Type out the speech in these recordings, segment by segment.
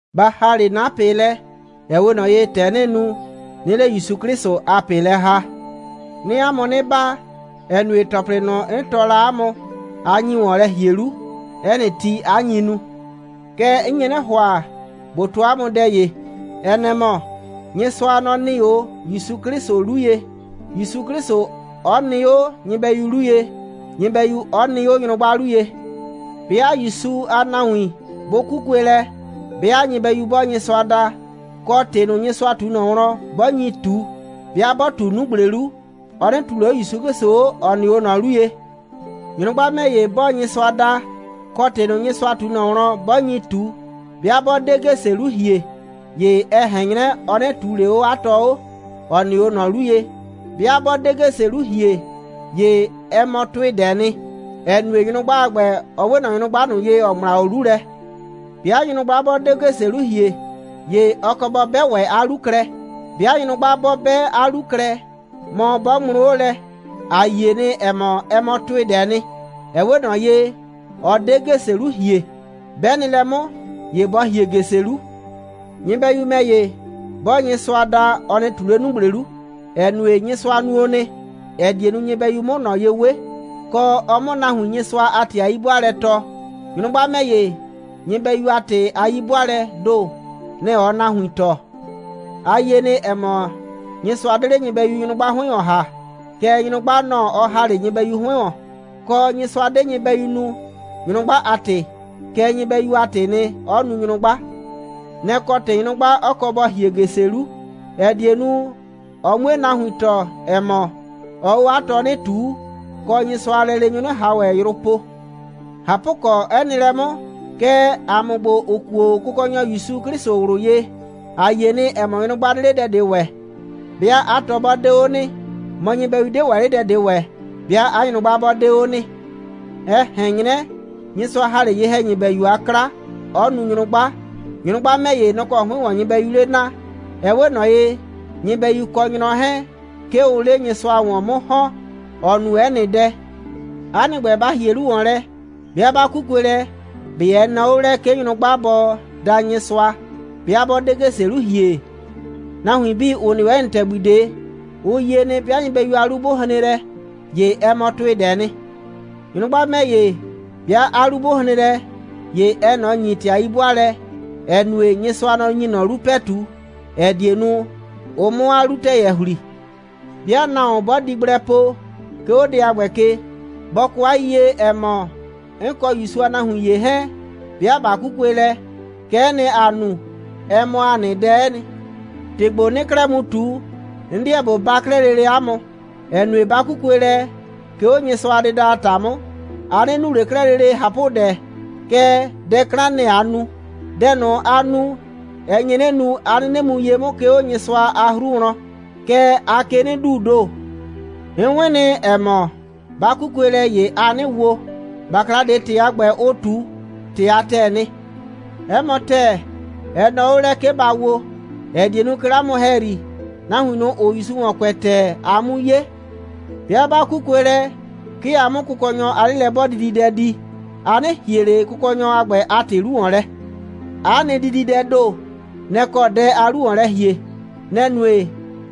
Ba ‑ha 'le 'na ꞊pɩ lɛ, ‑ɛ 'we ꞊nɔ ye, ‑tɛ 'nɩɩ nu, 'nɩɩ 'le ‑Yusu 'Klɩsʋ a ꞊pɩ lɛ ‑ha. 'Nɩɩ 'a mʋ 'nɩ baa, ‑ɛ nue, ‑tɔplɩ ꞊nʋ, 'n tɔɔ la 'a mʋ, a nyi ‑wɔn lɛ ‑hie 'lu, 'ɛ nɩ ti, 'a nyi nu. Kɛɛ, 'n nye 'nɩ ‑hʋa, ꞊bo tɔɔ 'a mʋ dɛ ‑ye. Ɛ nɛ‑ mɔ: Nyɩsʋa, nɔ‑ nɩ 'o ‑Yusu 'Klɩsʋ 'lu ye, ‑Yusu 'Klɩsʋ 'ɔ nɩ 'o nyɩbɛyu 'lu ye, nyɩbɛyu 'ɔ nɩ 'o nyrʋgba 'lu ye. 'Bɩa ‑Yusu a nahuin 'bʋ 'kukue lɛ, 'bɩa nyɩbɛyu 'bɔɔ Nyɩsʋa da, kɔ, ‑tɩ ꞊nʋ, Nyɩsʋa ꞊tu ꞊nɔ wlɔn, 'bɔ nyi ꞊tu, 'bɩa 'bɔ ꞊tu 'nugble 'lu, ɔ 'nɩ ꞊tuu ꞊le 'o ‑Yusu 'Klɩsʋ 'o, ‑ɔ nɩ 'o ꞊nɔ 'lu ye. Nyrʋgba ‑mɛ ‑ye 'bɔɔ Nyɩsʋa da, kɔ, ‑tɩ ꞊nʋ, Nyɩsʋa ꞊tu ꞊nɔ wlɔn, 'bɔ nyi ꞊tu, 'bɩa 'bɔ 'de ‑gese 'lu ‑hie, ‑ye ɛ ꞊hɛn 'nyrɛ, ɔ 'nɩ ꞊tuu ꞊le 'o 'a tɔ 'o, ‑ɔ nɩ 'o ꞊nɔ 'lu ye. 'Bɩa 'bɔ 'de ‑gese 'lu ‑hie, ‑ye ɛ mɔ ‑tʋɩdɛɛ nɩ, ‑ɛ nue, nyrʋgba a ‑gbɛ, ɔ 'we ꞊nɔ nyrʋgba ꞊nʋ ye, ‑ɔ ŋmla 'o 'lu lɛ. 'Bɩa nyrʋgba 'bɔ 'de ‑gese 'lu ‑hie, ‑ye ɔ kɔ bɔ 'bɛ ‑wɛ 'a 'lu klɛ. 'Bɩa nyrʋgba 'bɔ 'bɛ 'a 'lu klɛ, mɔ 'bɔ ŋmlʋ 'o lɛ, ‑a yie nɩ, ‑ɛ mɔ, ɛ mɔ ‑tʋɩdɛɛ nɩ. Ɛ 'we ꞊nɔ ye, ɔ 'de ‑gese 'lu ‑hie. 'Bɛ nɩ lɛ 'mʋ, ‑ye bɔ ‑hie ‑gese 'lu. Nyɩbɛyu ‑mɛ ‑ye, 'bɔɔ Nyɩsʋa da, ɔ nɩ ꞊tu 'le 'nugble 'lu, ‑ɛ nue, Nyɩsʋa nuo nɩ, ‑ɛ die nu, nyɩbɛyu 'mʋ ꞊nɔ ye 'we, kɔ, ɔ 'mʋ nahuin Nyɩsʋa a ‑tɩ a 'yi'bʋaalɛ tɔɔ. Nyrʋgba ‑mɛ ‑ye, nyɩbɛyu a ‑tɩ a 'yi'bʋaalɛɛ ‑do, nɛ‑ ɔɔ nahuin tɔɔ. A yie nɩ, ‑ɛ mɔ, Nyɩsʋa 'de 'le nyɩbɛyu nyrʋgba 'hʋɩn ‑wɔn ‑ha, kɛɛ, nyrʋgba, nɔ‑ ɔ ‑ha 'le nyɩbɛyu 'hʋɩn ‑wɔn. Kɔ, Nyɩsʋa 'de nyɩbɛyu nu, nyrʋgba a ‑tɩ, kɛɛ, nyɩbɛyu a ‑tɩɩ nɩ, 'ɔ nu nyrʋgba. Nɛ‑ kɔ ‑tɩ, nyrʋgba 'ɔ kɔ bɔ ‑hie ‑gese 'lu, ‑ɛ die nu, ɔ 'mue nahuin tɔɔ, ‑ɛ mɔ, ɔɔ 'o 'a tɔ 'nɩ ꞊tuu, kɔ, Nyɩsʋa a lɛleenyʋ 'nɩ ꞊han ‑wɛ yrʋ po. ꞊Hapʋkɔ, 'ɛ nɩ lɛ 'mʋ, kɛɛ, ‑a mʋ ‑gbo, ‑ʋ kuo Kɔkɔnyɔ ‑Yusu 'Klɩsʋ ꞊wlʋ ye, ‑a yie nɩ, ‑ɛ mɔ, nyrʋgba 'de 'le dɛ ꞊de ‑wɛ, 'bɩa 'a tɔ 'bɔ 'de 'o nɩ, mɔ, nyɩbɛyu 'de ‑wɛ 'le dɛ ꞊de ‑wɛ, 'bɩa 'a nyrʋgba 'bɔ 'de 'o nɩ. Ɛ ꞊hɛn 'nyrɛ, Nyɩsʋa ‑ha 'le ye‑hɛnyɩbɛyu a 'kla, 'ɔ nu nyrʋgba, nyrʋgba ‑mɛ ‑ye, nɔ‑ kɔ 'hʋɩn ‑wɔn nyɩbɛyuu 'le naa. Ɛ 'we ꞊nɔ ye, nyɩbɛyu kɔ nyrɔ 'hɛɛn, 'ke ʋʋ 'le Nyɩsʋa ‑wɔn 'mʋ ‑hɔn, ‑ɔ nu 'ɛ nɩ dɛ. 'A nɩ ‑gbɛ, ba ‑hie 'lu ‑wɔn lɛ, 'bɩa 'ba 'kukue lɛ, ꞊be ɛ nɔɔ 'o lɛ, 'ke nyrʋgba bɔ da Nyɩsʋa, 'bɩa 'bɔ 'de ‑gese 'lu ‑hie? Nahuin 'bii, ‑ʋ nɩ 'o 'ɛ nɩ ‑tɛgbi ꞊de, ʋ yie nɩ, 'bɩa nyɩbɛyu a 'lu 'bʋ hren lɛ, ‑ye ɛ mɔ ‑tʋɩdɛɛ nɩ. Nyrʋgba ‑mɛ ‑ye, 'bɩa 'a 'lu 'bʋ hren lɛ, ‑ye ɛɛ ꞊nɔ ‑nyi ‑tɩ a 'yi'bʋaalɛ, ‑ɛ nue, Nyɩsʋa, nɔ‑ ‑nyi ꞊nɔ 'lu ‑pɛtu, ‑ɛ die nu, ʋ 'mʋ 'a 'lutɛyɛ ‑hli. 'Bɩa nahuon 'bɔ di gblɛ po, 'ke 'o dɛ a ‑gbɛ ke, bɔ kɔ 'a yiyie, ‑ɛ mɔ, 'n kɔ ‑Yusu a nahuin ‑ye 'hɛɛn, 'bɩa ꞊ba 'kukue lɛ, kɛ'ɛ nɩ, ‑aa nu. Ɛ mɔ ‑a nɩ dɛ'ɛ nɩ. ‑Tɩ ‑gbo, 'nɩɩ 'klɛɛ mu ꞊tu, 'n 'deɛ ꞊bo baa 'klɛɛ lele 'a mʋ, ‑ɛ nue, 'ba 'kukue lɛ, 'ke 'o Nyɩsʋa a dɩda a ‑ta 'mʋ, a 'nɩ nu ꞊le 'klɛɛ lele ꞊hapʋdɛ, kɛɛ, dɛ 'klan, nɛ‑ aa nu. Dɛ ꞊nʋ, aa nu, ɛ nye 'nɩ nu, 'a 'nɩnɩ mu ye 'mʋ, 'ke 'o Nyɩsʋa a 'hru wlɔn, kɛɛ, aa ke 'nɩ duu ‑do. 'N 'wɩn nɩ, ‑ɛ mɔ, 'ba 'kukue lɛ, ‑ye aa 'nɩ wo. ‑Bakla ꞊de, ‑tɩ a ‑gbɛ, ʋʋ ꞊tu, ‑tɩ a ‑tɛɛ nɩ. 'Ɛ mɔ ‑tɛɛ, ɛ nɔɔ 'o lɛ, 'ke ba wo, ‑ɛ die nu, 'ke 'le 'a mʋ ‑hɛyri, nahuin ꞊nʋ, ‑ʋʋ ‑Yusu ‑wɔn kʋɛ ‑tɛɛ, a 'mu 'ye. 'Bɩa 'ba 'kukue lɛ, 'ke a 'mʋ Kʋkɔnyɔ a 'lelɛ'bɔɔdididɛ di, a 'nɩ ‑hie ꞊le Kʋkɔnyɔ a ‑gbɛ a ‑tɩ 'lu ‑wɔn lɛ. 'A nɩ dididɛɛ ‑do, nɛ‑ kɔ dɛ aa 'lu ‑wɔn lɛ ‑hie. Nɛ‑ nue,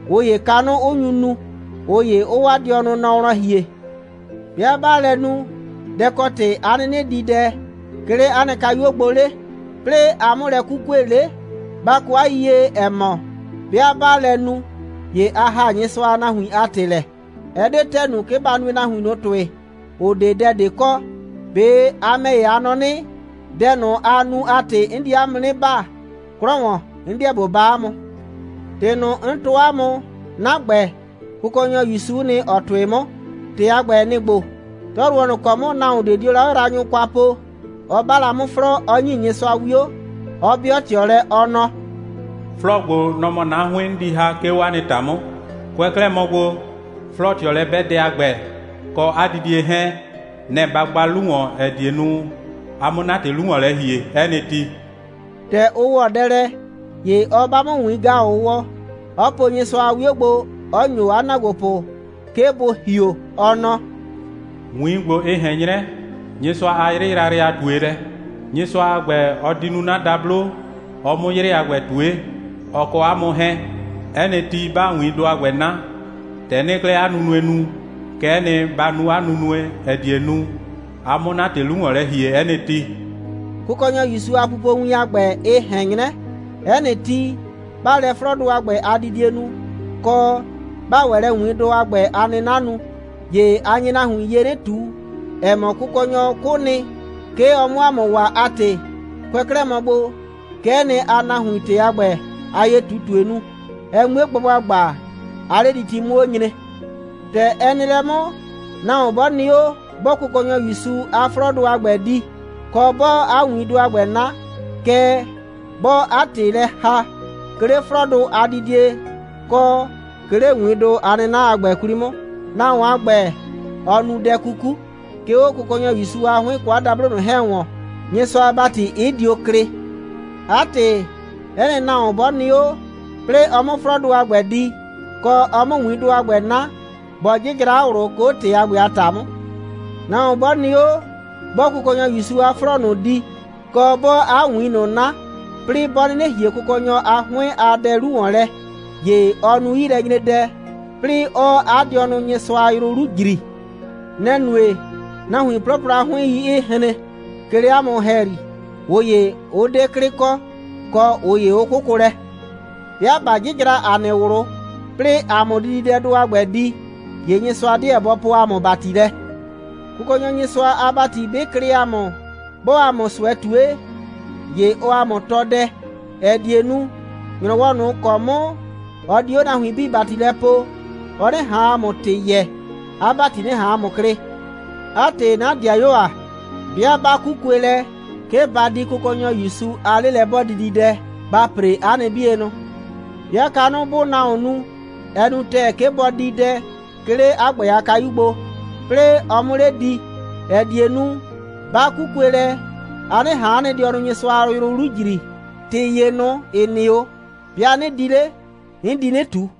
꞊ʋ ‑ye, kanʋ 'ʋ nyu nu, ꞊ʋ ‑ye 'ʋʋ 'waa dɩɔnʋ nɔ wlɔn ‑hie. 'Bɩa 'baa lɛ nu, dɛ‑ kɔ ‑tɩ 'a 'nɩnɩ di dɛ, 'ke 'le 'a nɩ kayuo gbo 'le, 'plɩɩ a 'mʋ lɛ 'kukue 'le? Ba kɔ 'a yiyie, ‑ɛ mɔ, 'bɩa 'baa lɛ nu, ‑ye a ‑haa Nyɩsʋa a nahuin a ‑tɩ lɛ. Ɛ 'de ‑tɛɛ nu, 'ke ba nue nahuin ꞊nʋ ‑tʋɩ, ‑ʋ 'de dɛ ꞊de kɔ. ꞊Be a ‑mɛ ‑ye, a nɔ 'nɩ, dɛ ꞊nʋ, aa nu a ‑tɩ, 'n di 'a mʋ 'nɩ baa? 'Klɔ ‑wɔn, 'n 'deɛ ꞊bo baa 'a mʋ. ‑Tɩ ꞊nʋ, 'n tɔɔ 'a mʋ, 'na ‑gbɛ, Kʋkɔnyɔ ‑Yusu'u nɩ, ‑ɔ tʋɩ 'mʋ. ‑Tɩ a ‑gbɛ, nɩ‑ ‑gbo: 'Tɔyrʋwɔ ꞊nʋ ‑kɔ 'mʋ nahuon ꞊de dio la 'a yraanyʋ kwa po, ɔ 'ba la 'mʋ 'flɔɔ, 'ɔ ‑nyi Nyɩsʋa 'wio, 'ɔ 'bɩɔ ꞊tɩɔ lɛ, ɔ nɔ: «'Flɔɔ ‑gbo, nɔ‑ mɔ 'na 'hʋɩn, 'n di ‑ha, 'ke 'o 'a nɩ ‑ta 'mʋ. Kʋɛ 'klɛɛ mɔ gbo, 'flɔɔ꞊tɩɔlɛ'bɛdɛ a ‑gbɛ, kɔ 'a didie 'hɛɛn, nɛ‑ ba gba 'lu ‑wɔn, ‑ɛ die nu, a 'mʋ 'na ‑tɩ 'lu ‑wɔn lɛ ‑hie 'ɛ nɩ ti.» ‑Tɛ ʋ ‑wɔ dɛ lɛ, ‑ye ɔ 'ba 'mʋ ‑wiin‑gaʋwɔ, 'ɔ po Nyɩsʋa a 'wio gbo, 'ɔ ‑nyo 'a ‑naagbopʋ, 'ke bʋ ‑hio, ɔ nɔ: «‑Wiin ‑gbo, ɩ ꞊hɛn 'nyrɛ Nyɩsʋa a 'yrɩ yrayrɩ a ꞊tuelɛ. Nyɩsʋa a ‑gbɛ, ɔ di nu 'na dablo, ɔ 'mʋ 'yrɩ a ‑gbɛ ꞊tue, ɔ kɔ 'a mʋ 'hɛɛn. 'Ɛ nɩ ti, 'baa ‑wiindʋ a ‑gbɛ 'na, ‑tɛ 'nɩɩ 'klɛɛ 'a nunue nu, kɛ'ɛ nɩ, ba nu 'a nunue, ‑ɛ die nu, a 'mʋ 'na ‑tɩ 'lu ‑wɔn lɛ ‑hie 'ɛ nɩ ti.» Kʋkɔnyɔ ‑Yusu a pupowin a ‑gbɛ, ɩ ꞊hɛn 'nyrɛ, 'ɛ nɩ ti, 'baa lɛ 'flɔɔdʋ a ‑gbɛ a didie nu, kɔ, 'baa ‑wɛ lɛ ‑wiindʋ a ‑gbɛ a 'nɩna nu, ‑ye a nye nahuin ye 'nɩ ꞊tu, ‑ɛ mɔ, Kʋkɔnyɔ 'kʋ nɩ, 'ke ɔ 'mʋ ‑a mʋ waa a ‑tɩ. Kʋɛ 'klɛɛ mɔ gbo, kɛ'ɛ nɩ, aa nahuin ‑tɩ a ‑gbɛ a ye꞊tutue nu, ɛ 'mue gba ‑gbagba, 'a 'lediti 'mʋ 'o nyre. ‑Tɛ ɛ nɩ lɛ 'mʋ, nahuon 'bɔ nɩ 'o, 'bɔɔ Kʋkɔnyɔ ‑Yusu a 'flɔɔdʋ a ‑gbɛ di, kɔ, 'bɔɔ 'a ‑wiindʋ a ‑gbɛ 'na, kɛɛ, 'bɔɔ 'a ‑tɩ lɛ ‑haa, 'ke 'le 'flɔɔdʋ a didie kɔ 'ke 'le ‑wiindʋ a 'nɩna a ‑gbɛ 'kwli 'mʋ, nahuon a ‑gbɛ, ɔɔ nu dɛ 'kuku, 'ke 'o Kʋkɔnyɔ ‑Yusu a 'hʋɩn, kɔ 'a dablo ꞊nʋ 'hɛɛn ‑wɔn, Nyɩsʋa a ‑bati 'ɩ dio klɩ. 'A ‑tɩ, 'ɛ nɩ nahuon 'bɔ nɩ 'o, 'plɩɩ ɔ 'mʋ 'flɔɔdʋ a ‑gbɛ di, kɔ, ɔ 'mʋ ‑wiindʋ a ‑gbɛ 'na, bɔ 'jɩjra 'a ꞊wlʋ, 'ke 'o ‑tɩ a ‑gbɛ a ‑ta 'mʋ. Nahuon 'bɔ nɩ 'o, 'bɔɔ Kʋkɔnyɔ ‑Yusu a 'flɔɔ ꞊nʋ di, kɔ, 'bɔɔ 'a ‑wiin ꞊nʋ 'na, 'plɩɩ 'bɔ 'nɩnɩ ‑hie Kʋkɔnyɔ a 'hʋɩn a dɛ 'lu ‑wɔn lɛ, ‑ye ɔɔ nu 'yilɛnyredɛ, 'plɩɩ 'ɔɔ 'a dɩɔnʋ Nyɩsʋa a yrʋ 'lu ‑jri. Nɛ‑ nue, nahuin 'plɔplɔ a 'hʋɩn.i 'ɩɩ hren, 'ke 'le 'a mʋ ‑hɛyri, ꞊ʋ ‑ye 'ʋ 'de 'klɩ kɔ, kɔ ꞊ʋ ‑ye 'ʋ 'kʋkʋ lɛ. 'Bɩa ꞊ba 'jɩjra ‑a nɩ ꞊wlʋ, 'plɩɩ ‑a 'mʋ dididɛdʋ a ‑gbɛ di, ‑ye Nyɩsʋa 'deɛ bɔ poo ‑a mʋ ‑bati lɛ. Kʋkɔnyɔ Nyɩsʋa a ‑bati 'bɩ klɩ ‑a mʋ, 'bɔɔ ‑a mʋ ꞊sʋɛ ꞊tue, ‑ye ɔɔ ‑a mʋ tɔɔ dɛ, ‑ɛ die nu, ‑nyrɔwɔ ꞊nʋ ‑kɔ 'mʋ ɔ di 'o nahuin 'bii ‑bati lɛ poo, ɔ 'nɩ ꞊han ‑a mʋ ‑tɩ yɛɛ, 'a ‑bati 'nɩ ꞊han ‑a mʋ klɩ. 'A ‑tɩ, 'na ‑dɩayuo ‑a, 'bɩa 'ba 'kukue lɛ, 'ke ba di Kʋkɔnyɔ ‑Yusu a 'lelɛ'bɔɔdididɛ, ba ‑pre 'a nɩ 'bienʋ. 'Bɩa kanʋ 'bʋʋ nahuon nu, ɛ nu ‑tɛɛ, 'ke bɔ di dɛ, 'ke 'le 'a ‑gbɛ a kayu gbo, 'plɩɩ ɔ 'mʋ 'le di, ‑ɛ die nu, 'ba 'kukue lɛ, a 'nɩ ꞊han 'a nɩ dɩɔnʋ Nyɩsʋa a yrʋ 'lu ‑jri. ‑Tɩ ‑ye ꞊nʋ, ‑ɩ nɩ 'o, 'bɩa 'nɩ di 'le, 'n di 'nɩ ꞊tu.